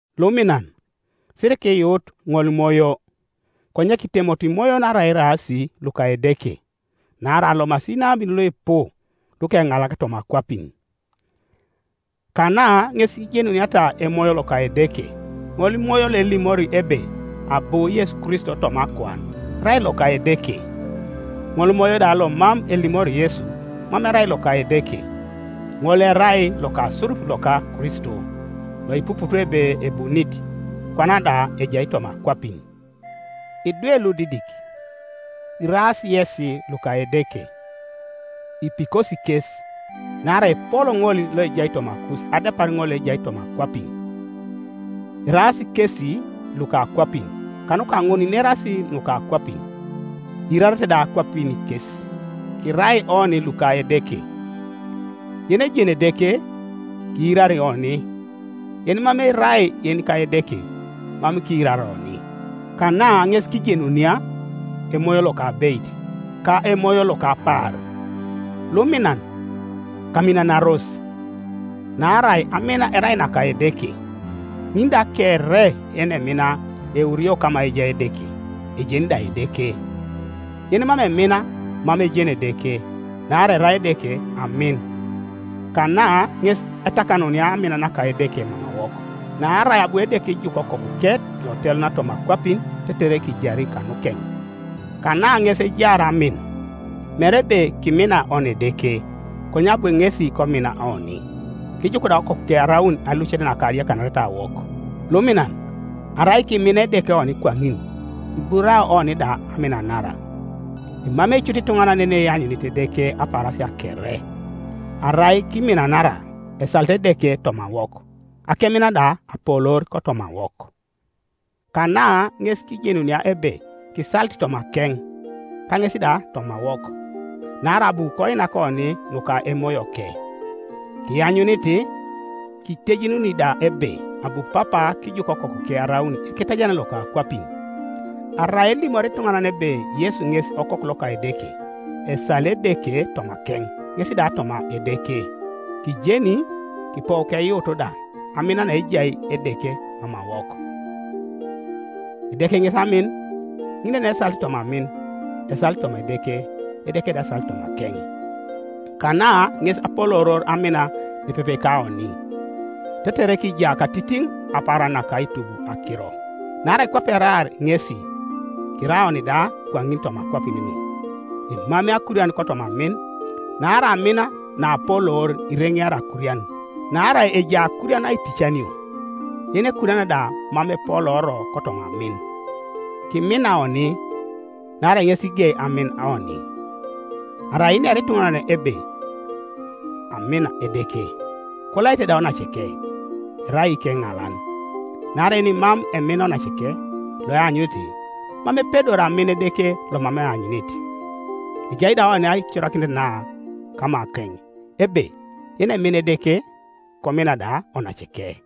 Luminan, sirikiyuut ŋolimoyo, konye kitemoto imoyon arai eraas luka Edeke; naarai alomasi inabin luipu lukeŋalak toma akwapin. Kana ŋes ijenuniata Emoyo loka Edeke; ŋolimoyo loelimori ebe abu Yesu Kristo toma akuan, erai loka Edeke. Ŋolimoyo da lomam elimori Yesu, mam erai loka Edeke, ŋol erai lokasurup loka Kristo, loipuput ebe ebunit, kwana da ejai toma akwapin. Idwe ludidik, iraas yesi luka Edeke, ipikosi kes, naarai epol ŋol loejai tomakus adepar ŋol loejai toma akwapin. Eraas kesi luka akwapin, kanuka ŋun inerasi nuka akwapin, iirarete da akwapin kes. Kirai oni luka Edeke. Yenejeni Edeke kiirari oni, yenimam erai yenika Edeke mam kiirari oni. Kana ŋes kijenunia emoyo loka abeit ka emoyo loka apaar. Luminan, kaminanaros, naarai amin erai naka Edeke, ŋin da kere yenemina eurio kama ejai Edeke, ejeni da Edeke. Yenimam emin mam ejeni Edeke, naarai erai Edeke amin. Kana ŋes etakanunia amin naka Edeke mamawok, naarai abu Edeke kijuk Okokuke loteluna toma akwapin tetere kijari kanukeŋ. Kana ŋes ejaar amin, mere ebe kimina oni Edeke, konye abu ŋesi komina oni, kijuk da Okokuke araun alucet naka adiakanaretawok. Luminan, arai kimina Edeke oni kwaŋin, kiburao oni da aminanara. Emamei cut ituŋanan yeneanyunit Edeke apaarasia kere; arai kiminanara, esalit Edeke tomawok, akemin da apoloor kotomawok. Kana ŋes kijenunia ebe kisalit tomakeŋ, ka ŋes da tomawok, naarai abu koinak oni nuka Emoyoke. Kianyunit, kitejenuni da ebe abu Papa kijuk Okokuke araun Eketajaran loka akwapin. Arai elimori ituŋanan ebe Yesu ŋes Okoku loka Edeke, esali Edeke tomakeŋ, ŋes da toma Edeke, Kijeni, kipou keyuut da, amin naejai Edeke mamawok. Edeke ŋes amin; ŋin da yenesalit toma amin, esalit toma Edeke, Edeke da esalit tomakeŋ. Kana ŋes apolooror amin nepepe kaoni, tetere kija katitiŋ kapaaran naka aitub akiro; naarai kwape eraar ŋesi, kirai oni da kwaŋin toma akwapin nu. Emamei akurian kotoma amin, naarai amin naapoloor ireŋeari akurian. Naarai ejai akurian aiticanio, yenekuriana da mam epolooro kotoma amin. Kimina oni, naarai ŋes kigei amin oni. Arai inera ituŋanan ebe, “Amin Edeke,” kolaite da onaceke, erai ikeŋalan. Naarai yenimam emina onaceke loeanyunit, mam epedori amin Edeke lomam eanyunit. Ejai da oni aicorakinet na kamakeŋ, ebe yenemina Edeke, komina da onaceke.